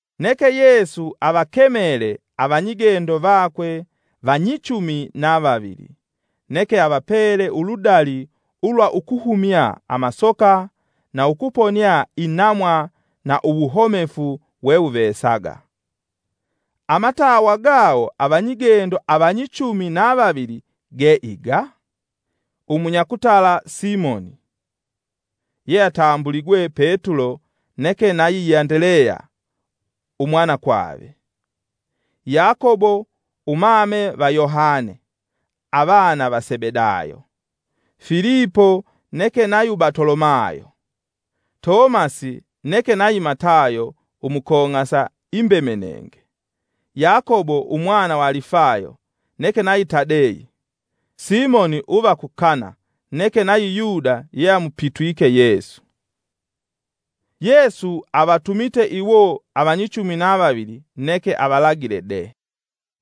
Neke Yesu avakemele avanyigendo vakwe vanyichumi na vavili, neke avapele uludali ulwa ukuhumya amasoka, na ukuponia inamwa na uwuhomefu wewuvesaga. Amatawa gawo avigendo avanyichumi na vavili ge iga: Umunyakutala Simoni, yeatambuligwe Petulo neke nayi Andeleya umwanakwave; Yakobo umame va Yohane avana va Sebedayo, Filipo neke nayi Batolomayo; Tomasi neke nayi Matayo umukong'asa imbemenenge; Yakobo umwana va Alifayo, neke nayi Tadeyi; Simoni uva ku Kana neke nayi Yuda yeamupitwike Yesu. Yesu avatumite iwo avanyichumi na vavili, neke avalagile de: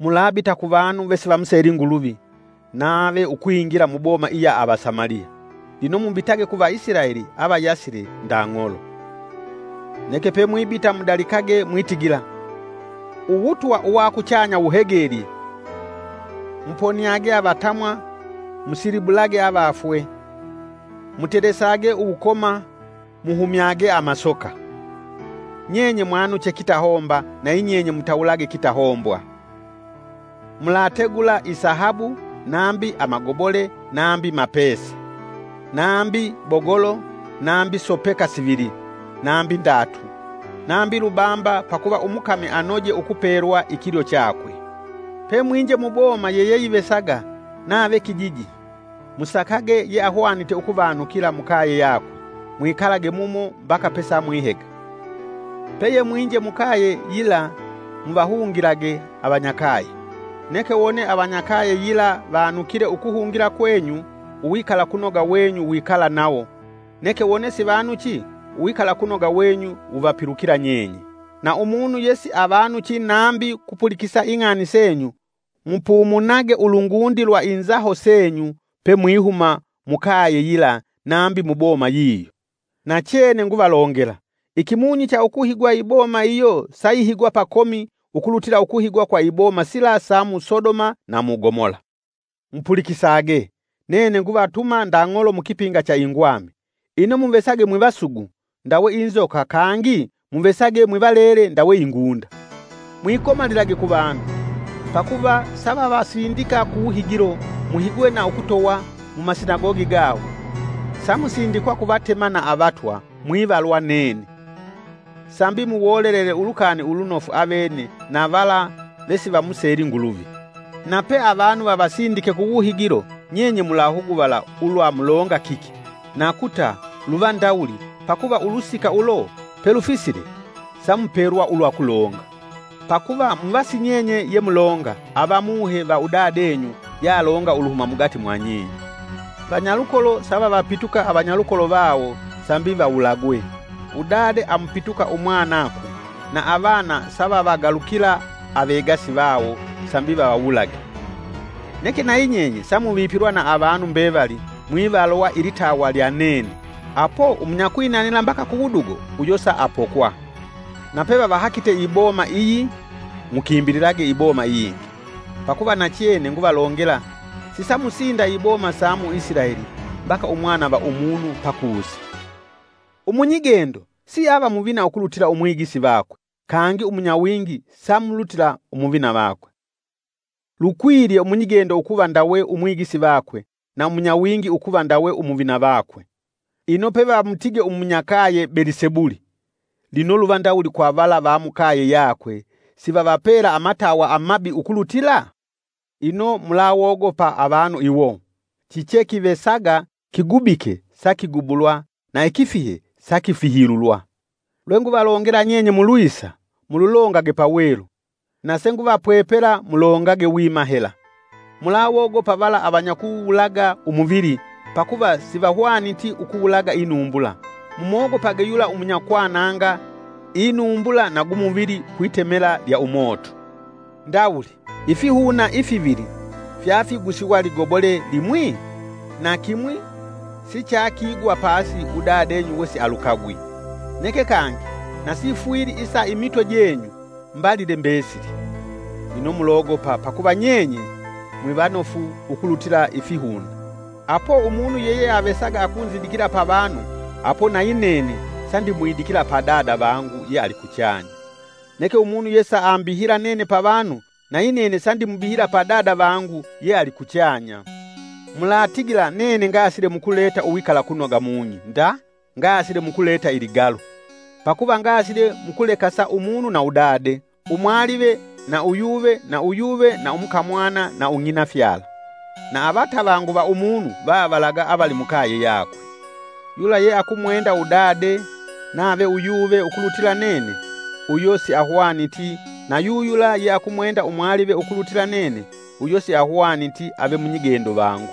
“Mulabita kuvanu vesivamuseli Nguluvi, nave ukwingila muboma iya ava Samaliya. Lino mubitage ku Vaisilaeli avayasile nda ng'olo. Neke pemwibita mudalikage mwitigila: ‘Uwutwa uwa kuchanya wuhegelye.’ Muponiage avatamwa, musilibulage avafwe, mutelesage uwukoma, muhumyage amasoka. Nyenye mwanuche kitahomba nayinyenye mutawulage kitahombwa. Mulategula isahabu, nambi magobole nambi mapesa. Nambi bogolo, nambi sopeka sivili, nambi ndatu, nambi lubamba pakuva umukami anoje ukupelwa ikilyo chakwe. “Pemwinje mu boma yiyeyivesaga nave kijiji, musakage yeahwanite ukuvanukila mukaye yakwe, mwikalage mumo mbaka pesamwihega. Peye mwinje mukaye yila muvahungilage avanyakaye. Neke wone avanyakaye yila vanukile ukuhungila kwenyu uwikalakunoga wenyu wikala nawo neke wone sivanuchi, uwikalakunoga wenyu wuvapilukila nyenye. Na umunu yesiavanuchi nambi kupulikisa ing'ani senyu mupumunage ulungundi lwa inzaho senyu pe mwihuma mukaye yila nambi muboma yiyo. Nachene nguvalongela, ikimunyi cha ukuhigwa iboma iyo sayihigwa pakomi ukulutila ukuhigwa kwa iboma sila sa mu Sodoma na mu Gomola.” “Mupulikisage, nene nguvatuma nda ng'olo mukipinga cha ingwami; ino muvesage mwivasugu ndawe inzoka kangi muvesage mwivalele ndawe ingunda. Mwikomalilage kuvanu; pakuva savavasindika kuwuhigilo, muhigwe na ukutowa mumasinagogi gawo. Samusindikwa ku vatema na avatwa, mwivalwa nene, sambi muwolelele Ulukani Ulunofu avene na vala vesivamuseli Nguluvi. Nape avanu vavasindike kuwuhigilo, nyenye mulahuguvala ulwa mulonga kiki nakuta luva ndawuli, pakuva ulusika ulo pelufisile, samupelwa ulwa kulonga. Pakuva muva si nyenye yemulonga, ava Muhe va udadenyu yalonga uluhuma mugati mwa nyenye. “Vanyalukolo savavapituka avanyalukolo vawo sambi vawulagwe, udade amupituka umwanakwe, na avana savavagalukila avegasi vawo sambi vavawulage. Neke nayi nyenye samuvipilwa na avanu mbevali mwivalwa ilitawa lya nene, apo umunyakwinatila mbaka ku wudugo uyo saapokwa.” “Nape vavahakite iboma iyi, mukimbililage iboma iyingi; pakuva nachene, nguvalongela, sisamusinda iboma sa mu Isilaeli, mbaka umwana va umunu pakusa.” “Umunyigendo siava muvina ukulutila umwigisi vakwe, kangi umunyawingi samulutila umuvina vakwe. Lukwilye umunyigendo ukuva ndawe umwigisi vakwe na umunyawingi ukuva ndawe umuvina vakwe. Ino pevamutige umunyakaye Belisebuli, lino luva ndawuli kwa vala vamukaye yakwe sivavapela amatawa amabi ukulutila?” “Ino mulawogopa avanu iwo. Chichekivesaga kigubike sakigubulwa na ikifihe sakifihilulwa. Lwenguvalongela nyenye mulwisa, mululongage pa welu; na senguvapwepela mulongage wima hela. Mulawogopa vala avanyakuwulaga umuvili pakuva sivahwaniti ukuwulaga inumbula; mumogopage yula umunyakwananga inumbula na gumuvili kwitemela lyaumoto. Ndawuli! ifihuna ifivili fyafigusiwa ligobole limwi? Na kimwi sichakigwa pasi udadenyu wesialukagwi. Neke kangi nasifwili isa imitwe jenyu mbalile mbesili. Ino mulogopa pakuva; nyenye mwivanofu ukulutila ifihuna.” “Apo umunu yeyeavesaga akunzidikila pavanu apo nayi nene sandimwidikila pa Dada vangu yealikuchanya. Neke umunu yesaambihila nene pavanu nayi nene sandimubihila pa Dada vangu yealikuchanya.” “Mulatigila nene ngasile mukuleta uwikalakunoga mung'i nda ngasile mukuleta iligalu. Pakuva ngasile mukulekasa umunu na udade, umwalive na uyuve na uyuve na umukamwana na ung'inafyala. Na avatavangu va umunu vavalaga avalimukaye yakwe.” “Yula yeakumwenda udade nave uyuve ukulutila nene uyo siahwaniti na yuyula ye akumwenda umwalive ukulutila nene uyo siahwaniti ave munyigendo vangu.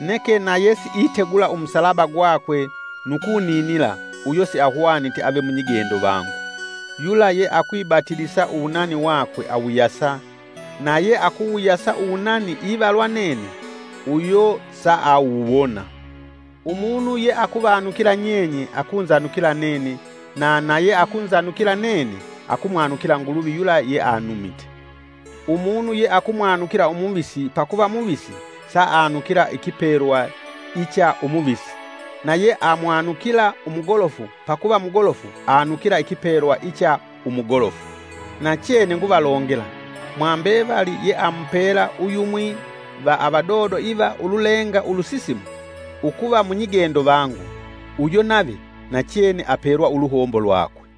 Neke na yesiitegula umusalaba gwakwe nu kuninila uyo siahwaniti ave munyigendo vangu. Yula yeakwibatilisa uwunani wakwe awuyasa na yeakuwuyasa uwunani ivalwa nene uyo saawuwona.” “Umunu yeakuvanukila nyenye akunzanukila nene na na yeakunzanukila nene akumwanukila Nguluvi yula yeanumite. Umunu ye akumwanukila umuvisi pakuva muvisi saanukila ikipelwa icha umuvisi, na yeamwanukila umugolofu pakuva mugolofu anukila ikipelwa icha umugolofu. Nachene nguvalongela, mwambevali yeamupela uyumwi va avadodo iva ululenga ulusisimu, ukuva munyigendo vangu, uyo nave nachene apelwa uluhombo lwakwe.”